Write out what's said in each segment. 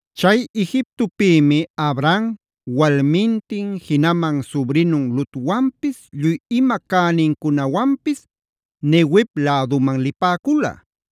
Chay Egiptopïmi Abram, walmintin jinaman subrinun Lotwanpis lluy ima cänincunawanpis Neguev läduman lipäcula.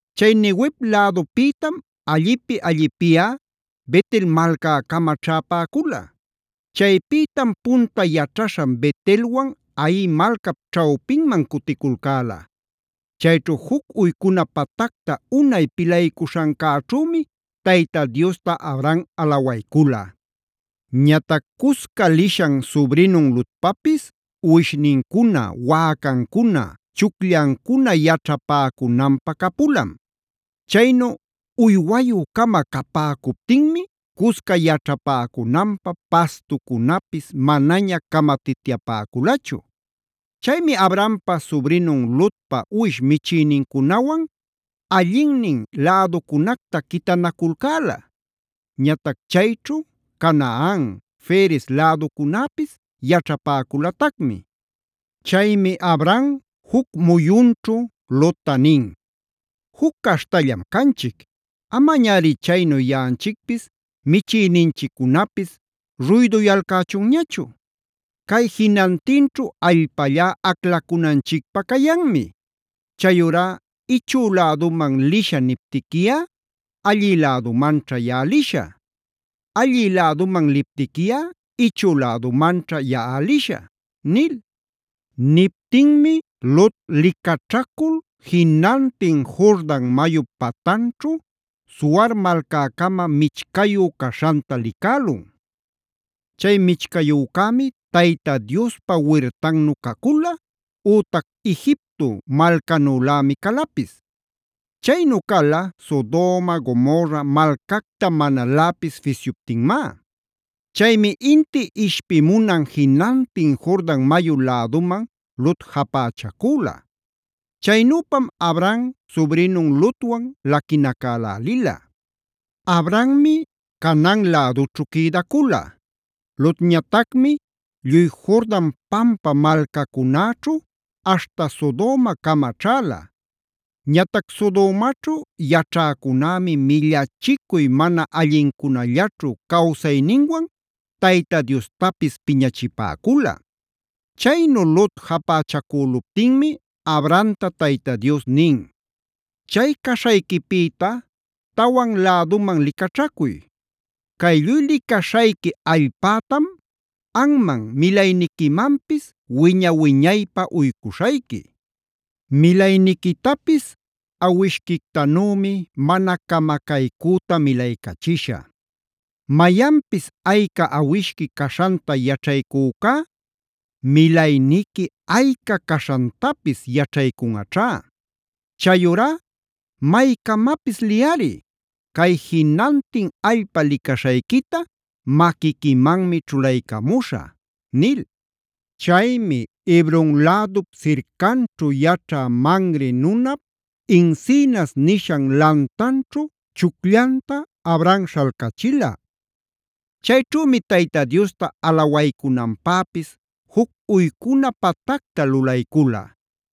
Chay Neguev lädupïtam allipi-allipiꞌa Bet-el malcäcama ćhäpäcula. Chaypïtam punta yaćhaśhan Bet-elwan Hai malcap ćhawpinman cuticulcäla. Chayćhu juc uycuna patacta unay pilaycuśhancäćhümi Tayta Diosta Abram alawaycula. Ñatac cusca lishan subrinun Lotpapis uwishnincuna, wäcancuna, chucllancuna yaćhapäcunanpä capulam. Chaynu uywayü-cama capäcuptinmi cusca yaćhapäcunanpä, pastucunapis manaña camatityapäculachu. Chaymi Abrampa subrinun Lotpa uwish michïnincunawan allinnin läducunacta quitanaculcäla. Ñatac chayćhu Canaan, Ferez läducunäpis yaćhapäculatacmi. Chaymi Abram juc muyunćhu Lotta nin: “Juc caśhtallam canchic; amañari chaynu yaꞌanchicpis michïninchiccunapis ruyduyalcächunñachu. Cay jinantinćhu allpallá aclacunanchicpä cayanmi. Chayurá ichü läduman lishä niptiquiꞌa, allï lädumanćha yaꞌa lishä; allï läduman liptiquiꞌa ichü lädumanćha yaꞌa lishä” nil. Niptinmi Lot licaćhacul jinantin Jordan mayup patanćhu Zoar malcäcama michcayu caśhanta licälun. Chay michcayücämi Tayta Diospa wirtannu cacula,a ütac Egipto malcanülämi calapis. Chaynu cala Sodoma, Gomorra malcacta manaläpis fisyuptinmá. Chaymi inti ishpimunan jinantin Jordan mayu läduman Lot japächacüla. Chaynüpam Abram subrinun Lotwan laquinacälälila. Abrammi Canaan lädućhu quïdacula; Lotñatacmi lluy Jordan pampa malcacunäćhu, aśhta Sodomacama ćhäla. Ñatac Sodomaćhu yaćhäcunämi millachicuy mana allincunallaćhu cawsayninwan Tayta Diostapis piñachipäcula. Chaynu Lot japächacüluptinmi Abramta Tayta Dios nin: “Chay caśhayquipïta tawan läduman licaćhacuy. Cay lluy licaśhayqui allpätam anman milayniquimanpis wiña-wiñaypä uycuśhayqui.b Milayniquitapis awishquictanümi mana camacaycüta milaycachishä. Mayanpis ayca awishqui caśhanta yaćhaycücá milayniqui ayca caśhantapis yaćhaycunꞌaćhá. Chayurá maycamapis liyꞌari; cay jinantin allpa licaśhayquita maquiquimanmi ćhulaycamuśhä” nil. Chaymi Hebron lädup sircanćhu yaćhä Mamre nunap encinas nishan lantanćhu chucllanta Abram śhalcachila. Chayćhümi Tayta Diosta alawaycunanpäpis juc uycuna patacta lulaycula.